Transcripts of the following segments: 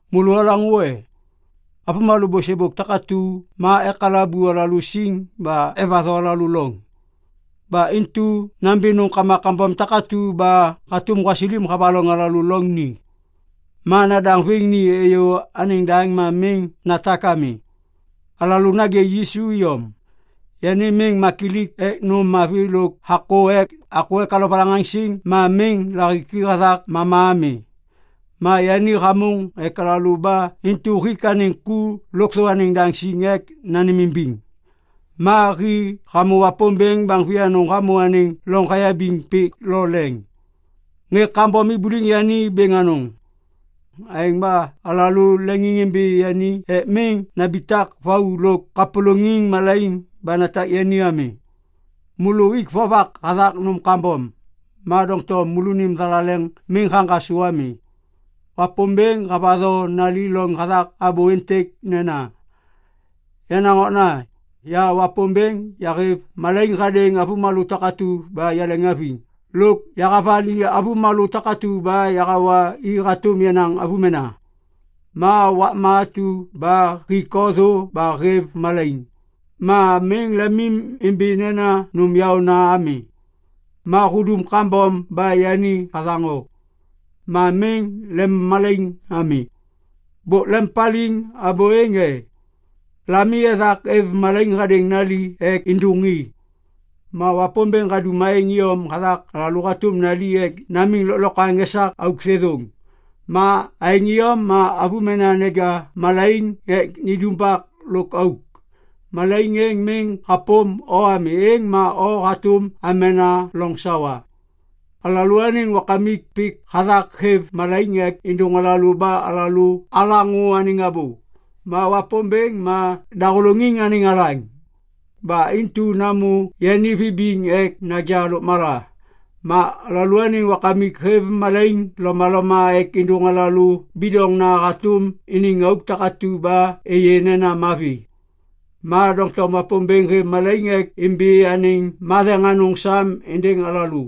Môlô olaŋô e? Avômalô bôsêbôk takatu ma ekalabu alalô siŋ ba evatho alalô loŋ. Ba intu nambi nômkama kambom takatu ba hatôm gwasilim havaloŋ alalô loŋ ni. Ma nadaŋviŋ ni êyô anêŋ daŋ ma miŋ natak ami. Alalô nagê Yisu iyom. Yani miŋ makilik ek nôm mavi lôk hakô ek alovalaŋaŋsiŋ ma miŋ lahiki hathak mama ami. Ma yani hamôŋ ek alalô ba intu hik anêŋ ku lôkthô anêŋ daŋ siŋ ek nanêmimbiŋ. Ma hi hamô Wapômbêŋ baŋ vianôŋ hamô anêŋ loŋ hayabiŋ pik lo leŋ. Ŋê kambom ibuliŋ yani bêŋ anôŋ. Aêŋ ba alalô leŋiŋimbi yani ek miŋ nambitak vau lôk kapôlôŋiŋ malaiŋ ba natak yani ami. Môlô uik vovak hathak nôm kambom, ma doŋtom môlônim thalaleŋ miŋ haŋgasô ami. Wapômbêŋ havatho nali loŋ hathak abô êntêk nena, “Yenaŋ okna, ya Wapômbêŋ yahêv malaiŋ hadêŋ avômalô takatu ba yaleŋhaviŋ lôk yahavali avômalô takatu ba yahawa i hatôm yenaŋ avômena. Ma wakma atu ba hik o thô ba hêv malaiŋ, ma miŋ lemimbi nena nôm yaôna ami. Ma hudum kambom ba yani hathaŋ o, ma miŋ lemmalaiŋ ami.” Bôk lempaliŋ abô êŋ e? Lami ethak êv malaiŋ hadêŋ nali ek êndôŋi. Ma Wapômbêŋ hadum aêŋ iyom hathak alalô hatôm nali ek namiŋ lôklokwaŋ esak auk thêthôŋ. Ma aêŋ iyom ma avômena neja malaiŋ ek nindumbak lôk auk. Malaiŋ êŋ miŋ hapôm o ami, êŋ ma o hatôm amena loŋ sawa. Alalôaniŋ wakamik pik hathak hêv malaiŋ ek êdôŋ alalô ba alaŋô anêŋ abô. Ma Wapômbêŋ ma dahôlôŋiŋ anêŋ alaŋ. Ba intu namô yani vibiŋ ek naja lôkmala. Ma alalôaniŋ wakamik hêv malaiŋ lomaloma ek êndôŋ alalô bidoŋna hatôm iniŋ auk takatu ba êyê nena mavi. Ma doŋtom Wapômbêŋ hêv malaiŋ ek imbi anêŋ matheŋ anôŋ sam êndêŋ alalô.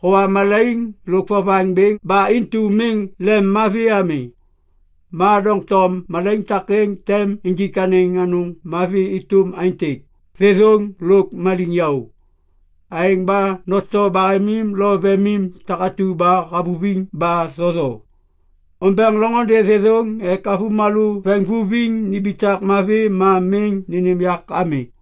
Howa malaiŋ lôk vovaŋ bêŋ ba intu miŋ lemmavi ami. Ma doŋtom malaiŋ takêŋ tem injik anêŋ anôŋ mavi êtôm aêntêk, thêthôŋ lôk maliŋyaô. Aêŋ ba noto bahemim lo vemim takatu ba havuviŋ ba thotho. Ombeŋ loŋôndê thêthôŋ ek avômalô veŋvuviŋ nimbitak mavi ma miŋ nênêm yak ami.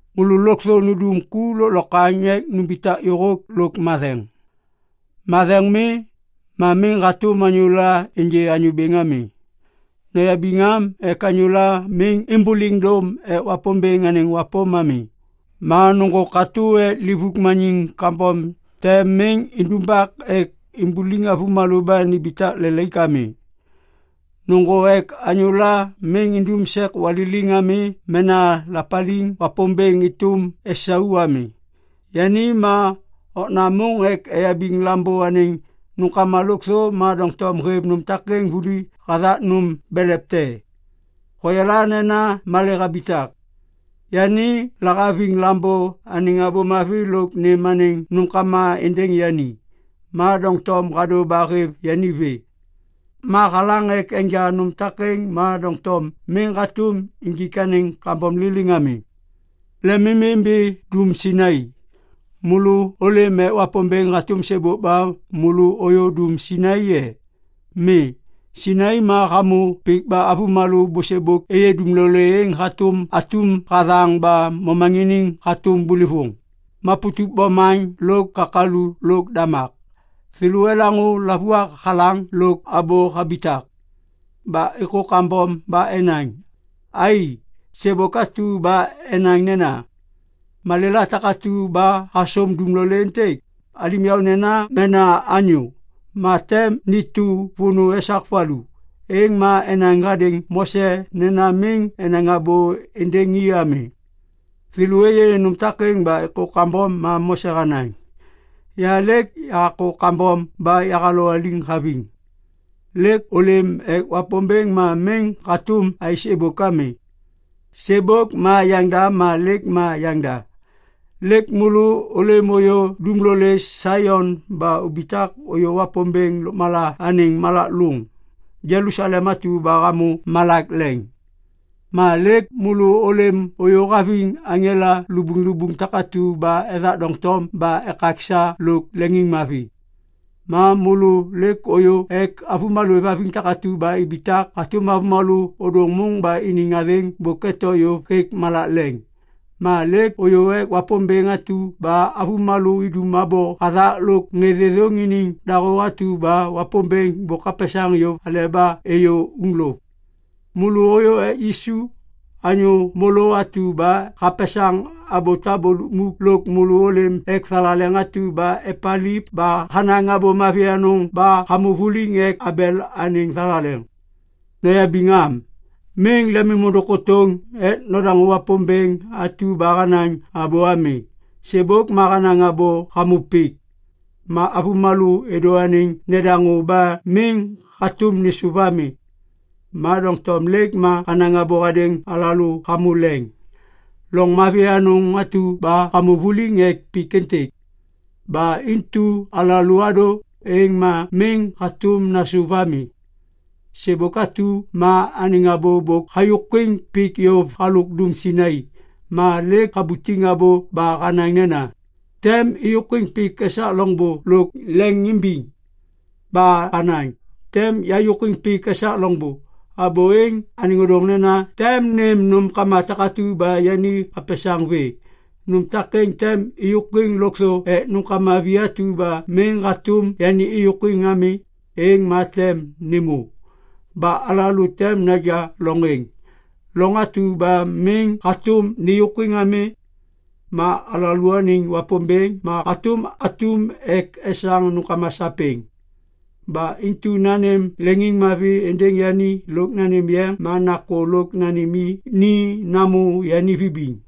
Môlô lôkthô nundum ku lôklokwaŋ ek numbitak yôhôk lôk matheŋ. Matheŋ mi, ma miŋ hatôm anyôla ênjê Anyô Bêŋ ami. Noyabiŋ am ek anyôla miŋ êmbôliŋ dôm ek Wapômbêŋ anêŋ wapôm ami. Ma nôŋgô katô ek livuk maniŋ kambom te miŋ indumbak ek imbuliŋ avômalô ba nimbitak lelaik ami. Nôŋgô ek anyôla miŋ indum sek waliliŋ ami mena lapaliŋ Wapômbêŋ êtôm Isau ami. Yani ma okna môŋ ek eyabiŋ lambô anêŋ nômkama lôkthô ma doŋtom hêv nôm takêŋ vuli hathak nôm belev te. Hoyala nena malê habitak. Yani lahaviŋ lambô enaŋ abô mavi lôk nêm anêŋ nômkama êndêŋ yani, ma doŋtom hadô ba hêv yani vê. Ma halaŋ ek enja nôm takêŋ ma doŋtom miŋ hatôm injik anêŋ kambom liliŋ ami. Lemimimbi dum Sainai. Môlô ôlêm ek Wapômbêŋ hatôm sêbôk ba môlô ôyô dum Sainai e? Mi. Sainai ma hamô pik ba avômalô bôsêbôk êyê dumlolê êŋ hatôm atum hathaŋ ba momaŋiniŋ hatôm bôlôvôŋ, maputup bomaŋ lôk kakalu lôk damak. Thêlô elaŋô lavuak halaŋ lôk abô habitak. Ba êkô kambom ba enaŋ, “Ai! Sêbôk atu ba enaŋ nena, ‘Malêla takatu ba hasôm dumlolê êntêk, alim yaônena mena anyô, ma tem nitu vônô esak valu.’” Êŋ ma enaŋ hadêŋ Mose nena miŋ enaŋ abô êndêŋ i ami. Thêlô êyê nôm takêŋ ba êkô kambom ma Mose hanaŋ, “Ya lêk yahakô kambom ba yahalowaliŋ haviŋ.” Lêk ôlêm ek Wapômbêŋ ma miŋ hatôm aêsêbôk ami. Sêbôk ma yaŋda ma lêk ma yaŋda. Lêk môlô ôlêm ôyô dumlolê Saion ba ubitak ôyô Wapômbêŋ lôkmala anêŋ malak lôŋ, Jelusalem atu ba hamô malak leŋ. Ma lêk môlô ôlêm ôyô haviŋ aŋela lubuŋlubuŋ takatu ba ethak doŋtom ba ekaksa lôk leŋiŋmavi. Ma môlô lêk ôyô ek avômalô êvhaviŋ takatu ba ibitak hatôm avômalô ôdôŋ môŋ ba iniŋ athêŋ bôk eto yôv hêk malak leŋ. Ma lêk ôyô ek Wapômbêŋ atu ba avômalô idum abô hathak lôk ŋê thêthôŋ iniŋ dahô atu ba Wapômbêŋ bôk hapesaŋ yôv aleba êyô uŋlôv. Môlô ôyô ek Yisu, anyô môlô atu ba hapesaŋ abô tabô lukmuk lôk môlô ôlêm ek thalaleŋ atu ba epaliv ba hanaŋ abô mavi anôŋ ba hamô vuliŋ ek Abel anêŋ thalaleŋ. Noyabiŋ am! Miŋ lemôndôŋ kôtôŋ ek nodaŋô Wapômbêŋ atu ba hanaŋ abô ami. Sêbôk ma hanaŋ abô hamô pik. Ma avômalô êdô anêŋ nedaŋô ba miŋ hatôm nêsôv ami. Ma doŋtom lêk ma hanaŋ abô hadêŋ alalô hamô leŋ, loŋ mavi anôŋ atu ba hamô vuliŋ ek pik êntêk. Ba intu alalô adô, êŋ ma miŋ hatôm nasôv ami. Sêbôk atu ma anêŋ abô bôk hayôkwiŋ pik yôv halôk dum Sainai. Ma lêk habutiŋ abô ba hanaŋ nena, “Tem êyôkwiŋ pik esak loŋbô lôk leŋ imbiŋ.” Ba hanaŋ, “Tem yayôkwiŋ pik esak loŋbô.” Abô êŋ anêŋ ôdôŋ nena tem nêm nômkama takatu ba yani hapesaŋ vê. Nôm takêŋ tem êyôkwiŋ lôkthô ek nômkama vi atu ba miŋ hatôm yani êyôkwiŋ ami, êŋ ma tem nêmô. Ba alalô tem naja loŋ êŋ, loŋ atu ba miŋ hatôm nêyôkwiŋ ami. Ma alalôaniŋ Wapômbêŋ ma hatôm atum ek esaŋ nômkama sapêŋ. Ba intu nanêm leŋiŋmavi êndêŋ yani lôk nanêm yeŋ ma nakô lôk nanêm i ni namô yani vibiŋ.